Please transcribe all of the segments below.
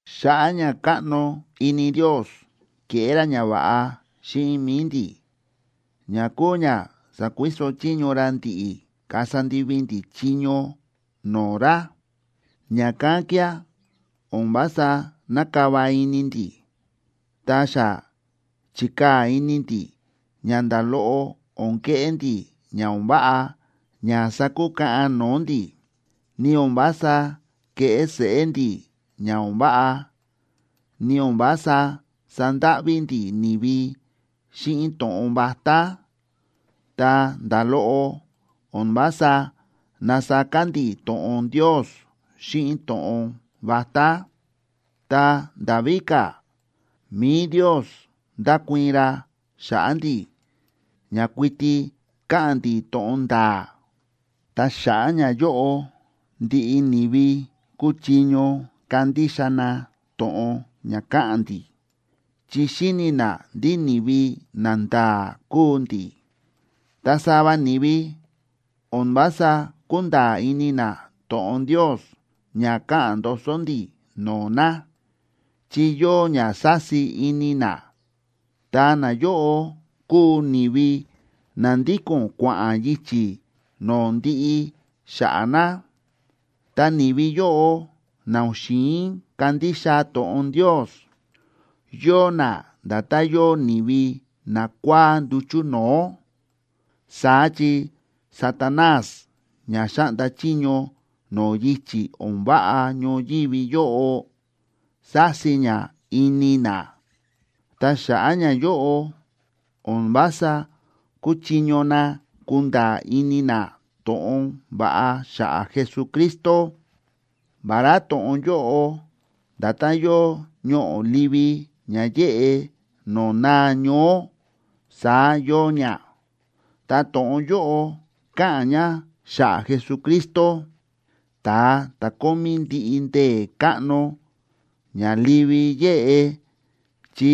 Xa̱ꞌa̱ ña káꞌno ini Ndios, ke̱ꞌé ra ñava̱ꞌa xíꞌin mi̱i ndi̱, ña kúu ña sa̱kuiso chiño ra ndi̱ꞌi̱ kasa ndivi ndi̱ chiño no̱o̱ ra. Ña̱kán kía̱ o̱n vása nákava ini ndi̱. Ta xa chi̱kaa̱ ini ndi̱ ña nda̱ loꞌo o̱n keꞌé ndi̱ ña o̱n váꞌa ña sakukaꞌan no̱o̱ ndi̱, ni o̱n vása kéꞌé seꞌé ndi̱ ña o̱n váꞌa, ni o̱n vása sándáꞌví ndi̱ ni̱vi xíꞌin to̱ꞌon vatá, ta nda̱ loꞌo o̱n vása násaka ndi̱ to̱ꞌon Ndios xíꞌin to̱ꞌon vatá. Ta nda̱ víka̱, mi̱i Ndios ndákuii̱n ra xa̱ꞌa̱ ndi̱ ña kuiti káꞌa̱n ndi̱ to̱ꞌon nda̱a̱. Ta xa̱ꞌa̱ ñayóꞌo ndiꞌi ni̱vi kúchiño kandixa na to̱ꞌon ña káꞌa̱n ndi̱, chi xíni̱ na ndí ni̱vi nanda̱a̱ kúu ndi̱. Ta sava ni̱vi o̱n vása kúnda̱a̱ ini na to̱ꞌon Ndios ña káꞌa̱n ndoso ndi̱ no̱o̱ na, chi yóo ña sási ini na, ta nayóꞌo kúu ni̱vi na ndíko̱n kua̱ꞌa̱n yichi̱ no̱o̱ ndiꞌi xa̱ꞌa̱ na. Ta ni̱vi yóꞌo na o̱n xi̱in kandixa to̱ꞌon Ndios, yóo na nda̱tán yóo ni̱vi nakua̱á nduchu̱ no̱o̱. Saá chi Satanás ña xáꞌnda chiño no̱o̱ yichi̱ o̱n váꞌa ñoyívi yóꞌo, sási ña ini na. Ta xa̱ꞌa̱ ñayóꞌo o̱n vása kúchiño na kunda̱a̱ ini na to̱ꞌon va̱ꞌa xa̱ꞌa̱ Jesucristo, vará to̱ꞌon yóꞌo nda̱tán yóo ñoꞌo̱ livi ña yéꞌe no̱o̱ naa ñoó, saá yóo ña. Ta to̱ꞌon yóꞌo káꞌa̱n ña xa̱ꞌa̱ Jesucristo, ta̱a ta̱ kómí ndiꞌi ndee̱ káꞌno ña livi yéꞌe, chi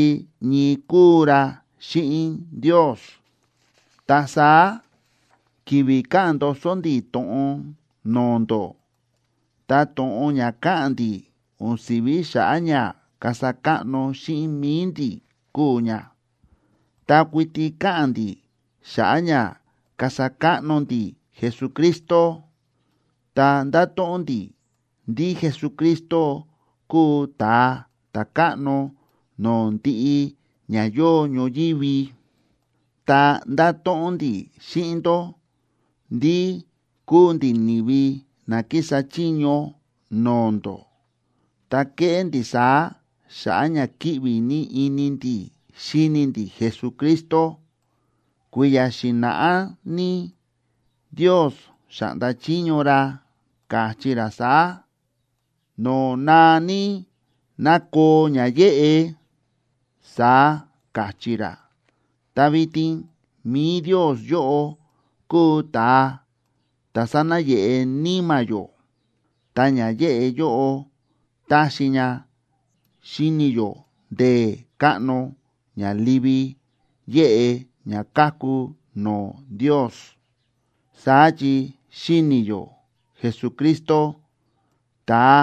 ñii kúu ra xíꞌin Ndios. Ta saá, ki̱vi̱ káꞌa̱n ndoso ndi̱ to̱ꞌon no̱o̱ ndó, ta to̱ꞌon ña káꞌa̱n ndi̱ o̱n si̱ví xa̱ꞌa̱ ña kasa káꞌno xíꞌin mi̱i ndi̱ kúu ña, ta kuiti káꞌa̱n ndi̱ xa̱ꞌa̱ ña kasa káꞌno ndi̱ Jesucristo, ta ndáto̱ꞌon ndi̱ ndí Jesucristo kúu Ta̱a Ta̱káꞌno no̱o̱ ndiꞌi ña yóo ñoyívi. Ta ndáto̱ꞌon ndi̱ xíꞌin ndó ndí kúu ndi̱ ni̱vi na kísa chiño no̱o̱ ndó, ta kéꞌé ndi̱ saá xa̱ꞌa̱ ña kíꞌvi ní ini ndi̱ xíni ndi̱ Jesucristo. Kui̱ya̱ xi̱na̱ꞌá ní Ndios xa̱ꞌnda chiño ra, káchí ra saá: “No̱o̱ naa ní, ná koo ña yéꞌe”, saá káchí ra. Ta vitin mi̱i Ndios yóꞌo kúu ta̱a ta̱ sánayeꞌe níma̱ yó, ta ña yéꞌe yóꞌo táxi ña xíni yó ndee̱ káꞌno ña livi yéꞌe ña káku no̱o̱ Ndios. Saá chi xíni yó Jesucristo, ta̱a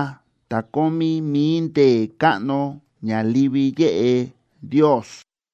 ta̱ kómí mi̱i ndee̱ káꞌno ña livi yéꞌe Ndios.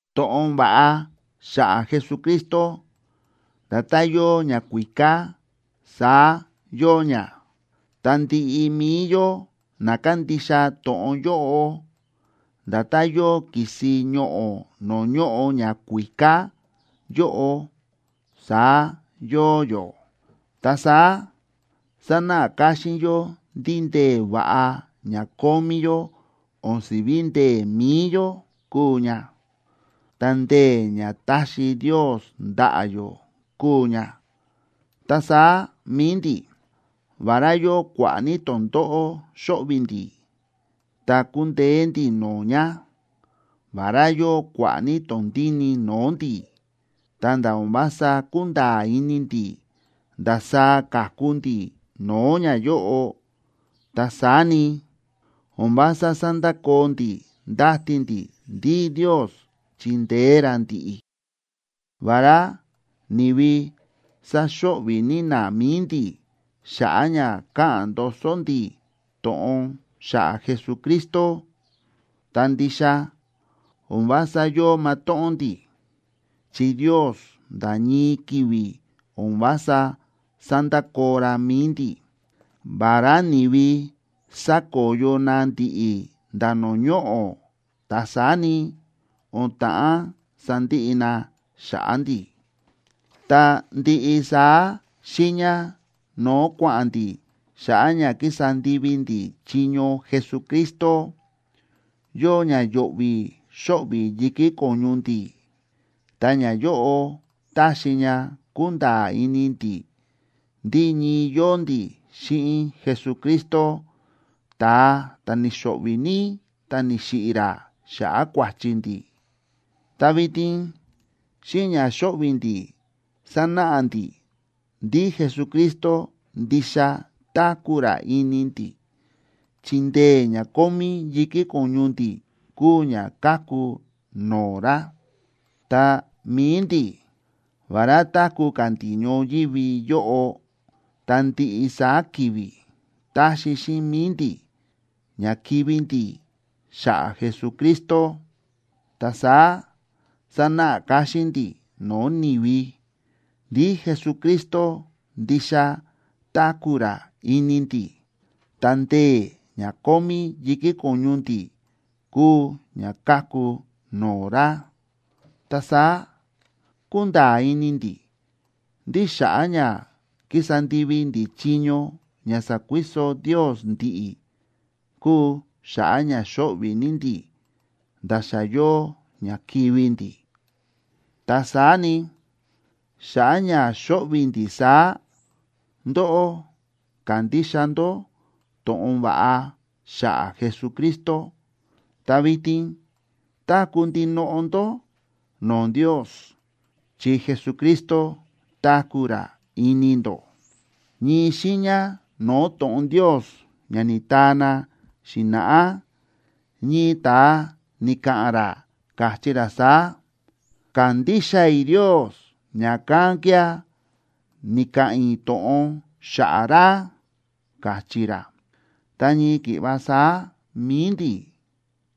To̱ꞌon va̱ꞌa xa̱ꞌa̱ Jesucristo nda̱tán yóo ñakuíká, saá yóo ña. Ta ndiꞌi mi̱i yó na kándixa to̱ꞌon yóꞌo, nda̱tán yóo ki̱si ñoꞌo̱ no̱o̱ ñóꞌo ñakuíká yóꞌo, saá yóo yó. Ta saá sánáꞌa káxín yó ndí ndee̱ va̱ꞌa ña kómí yó o̱n si̱ví ndee̱ mi̱i yó kúu ña, ta ndee̱ ña táxi Ndios ndaꞌa̱ yó kúu ña. Ta saá mi̱i ndi̱, vará yóo kua̱ꞌa̱ ní tondóꞌó xóꞌvi̱ ndi̱, ta kúndeé ndi̱ no̱o̱ ña. Vará yóo kua̱ꞌa̱ ní tondíni no̱o̱ ndi̱, ta̱nda̱ o̱n vása kúnda̱a̱ ini ndi̱ ndasaá ka̱ku ndi̱ no̱o̱ ñayóꞌo, ta saá ni, o̱n vása sándakoo ndi̱ ndáti ndi̱ ndí Ndios chindeé ra ndi̱ꞌi̱. Vará ni̱vi sáxo̱ꞌvi̱ ní na mi̱i ndi̱ xa̱ꞌa̱ ña káꞌa̱n ndoso ndi̱ to̱ꞌon xa̱ꞌa̱ Jesucristo, ta ndixa o̱n vása yóo matóꞌón ndi̱, chi Ndios nda̱ ñii ki̱vi̱ o̱n vása sándakoo ra mi̱i ndi̱. Vará ni̱vi sákoyo na ndi̱ꞌi̱ nda̱ no̱o̱ ñoꞌo̱, ta saá ni, o̱n ta̱ꞌán sandiꞌi na xa̱ꞌa̱ ndi̱. Ta ndiꞌi saá xiiña no̱o̱ kua̱ꞌa̱n ndi̱ xa̱ꞌa̱ ña kísa ndivi ndi̱ chiño Jesucristo, yóo ña yo̱ꞌvi̱ xóꞌvi̱ yi̱kí ko̱ñu ndi̱, ta ñayóꞌo táxi ña kúnda̱a̱ ini ndi̱ ndí ñii yóo ndi̱ xíꞌin Jesucristo, ta̱a ta̱ ni̱xo̱ꞌvi̱ ní ta ni̱xiꞌi̱ ra xa̱ꞌa̱ kua̱chi ndi̱. Ta vitin xíꞌin ña xóꞌvi̱ ndi̱ sánáꞌa ndi̱ ndí Jesucristo ndixa táku̱ ra ini ndi̱, chi ndee̱ ña kómí yi̱kí ko̱ñu ndi̱ kúu ña káku no̱o̱ ra. Ta mi̱i ndi̱, vará táku̱ ka̱ ndi̱ ñoyívi yóꞌo, ta ndiꞌi saá ki̱vi̱ táxi xíꞌin mi̱i ndi̱ ña kivi̱ ndi̱ xa̱ꞌa̱ Jesucristo. Ta saá sánáꞌa káxín ndi̱ no̱o̱ ni̱vi ndí Jesucristo ndixa táku̱ ra ini ndi̱, ta ndee̱ ña kómí yi̱kí ko̱ñu ndi̱ kúu ña káku no̱o̱ ra. Ta saá kúnda̱a̱ ini ndi̱ ndí xa̱ꞌa̱ ña kísa ndivi ndi̱ chiño ña sa̱kuiso Ndios ndi̱ꞌi̱ kúu xa̱ꞌa̱ ña xóꞌvi̱ ní ndi̱ nda̱ xa yóo ña kivi̱ ndi̱. Ta saá ni, xa̱ꞌa̱ ña xóꞌvi̱ ndi̱ saá, ndóꞌó ka̱ndixa ndó to̱ꞌon va̱ꞌa xa̱ꞌa̱ Jesucristo, ta vitin táku̱ ndinoꞌo ndó no̱o̱ Ndios chi Jesucristo táku̱ ra ini ndó. Ñii xiiña no̱o̱ to̱ꞌon Ndios ña ni̱taa na xi̱na̱ꞌá, ñii ta̱a ni̱ka̱ꞌa̱n ra, káchí ra saá: “Ka̱ndixa i̱ Ndios, ña̱kán kía̱ ni̱ka̱ꞌa̱n i̱ to̱ꞌon xa̱ꞌa̱ ra”, káchí ra. Ta ñii ki̱ꞌva saá mi̱i ndi̱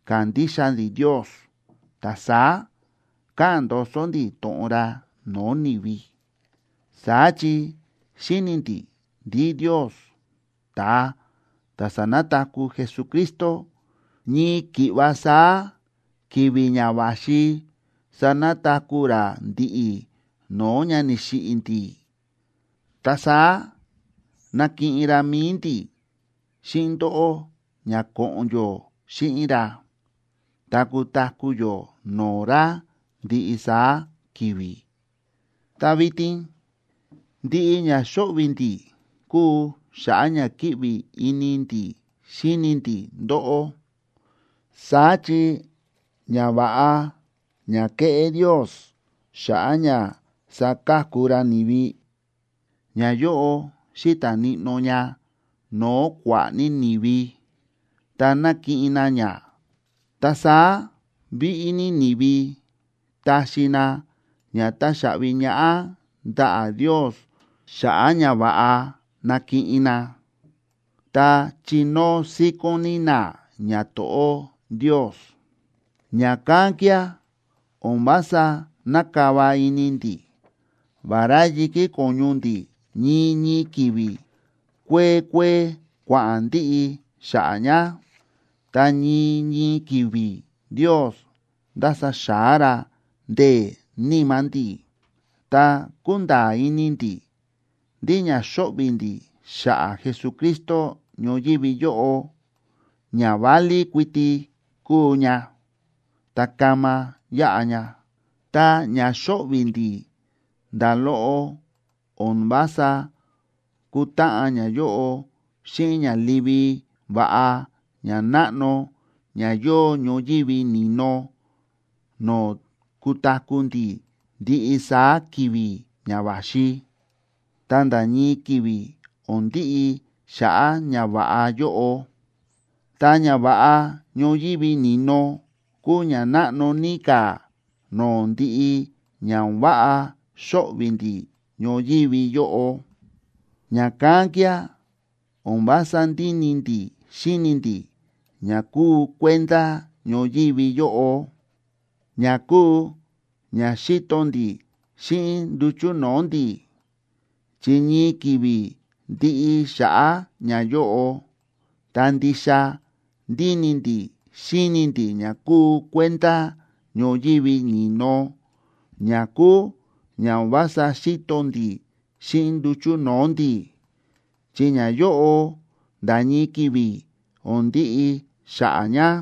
kándixa ndi̱ Ndios, ta saá káꞌa̱n ndoso ndi̱ to̱ꞌon ra no̱o̱ ni̱vi. Saá chi xíni̱ ndi̱ ndí Ndios, ta̱a ta̱ sa̱nataku̱ Jesucristo, ñii ki̱ꞌva saá ki̱vi̱ ña va̱xi sanataku̱ ra ndi̱ꞌi̱ no̱o̱ ña ni̱xiꞌi̱ ndi̱. Ta saá nakiꞌin ra mi̱i ndi̱ xíꞌin ndóꞌó ña ko̱ꞌo̱n yó xíꞌin ra ta kutaku̱ yó no̱o̱ ra ndiꞌi saá ki̱vi̱. Ta vitin ndiꞌi ña xóꞌvi̱ ndi̱ kúu xa̱ꞌa̱ ña kíꞌvi ini ndi̱ xíni ndi̱ ndóꞌó. Saá chi ñava̱ꞌa ña kéꞌé Ndios xa̱ꞌa̱ ña saka̱ku ra ni̱vi, ñayóꞌo xíta̱ níꞌnó ña no̱o̱ kua̱ꞌa̱ ní ni̱vi, ta nákiꞌin na ña. Ta saá víꞌí ní ni̱vi taxi na ña táxaꞌvi ñaꞌá ndaꞌa̱ Ndios xa̱ꞌa̱ ñava̱ꞌa nákiꞌin na, ta chinóo síkón ní na ñato̱ꞌó Ndios. Ña̱kán kía̱ o̱n vása nákava ini ndi̱. Vará yi̱kí ko̱ñu ndi̱ ñii ñii ki̱vi̱ kuee kuee kua̱ꞌa̱n ndiꞌi xa̱ꞌa̱ ña, ta ñii ñii ki̱vi̱ Ndios ndása xa̱á ra ndee̱ níma̱ ndi̱. Ta kúnda̱a̱ ini ndi̱ ndí ña xóꞌvi̱ ndi̱ xa̱ꞌa̱ Jesucristo ñoyívi yóꞌo ña válí kuiti kúu ña, ta kama yaꞌa ña. Ta ña xóꞌvi̱ ndi̱ nda̱ loꞌo o̱n vása kútáꞌan ñayóꞌo xíꞌin ña livi va̱ꞌa ña náꞌno ña yóo ñoyívi ni̱no no̱o̱ kutaku̱ ndi̱ ndiꞌi saá ki̱vi̱ ña va̱xi, ta nda̱ ñii ki̱vi̱ o̱n ndiꞌi xa̱ꞌa̱ ñava̱ꞌa yóꞌo. Ta ñava̱ꞌa ñoyívi ni̱no kuu ña náꞌno ní ka̱ no̱o̱ ndiꞌi ña o̱n váꞌa xóꞌvi̱ ndi̱ ñoyívi yóꞌo. Ña̱kán kía̱ o̱n vása ndíni ndi̱ xíni ndi̱ ña kúu kuenda ñoyívi yóꞌo, ña kúu ña xíto ndi̱ xíꞌin nduchu̱ no̱o̱ ndi̱, chi ñii ki̱vi̱ ndiꞌi xa̱ꞌa̱ ñayóꞌo. Ta ndixa ndíni ndi̱ xíni ndi̱ ña kúu kuenda ñoyívi ni̱no, ña kúu ña o̱n vása xíto ndi̱ xíꞌin nduchu̱ no̱o̱ ndi̱, chi ñayóꞌo nda̱ ñii ki̱vi̱ o̱n ndiꞌi xa̱ꞌa̱ ña.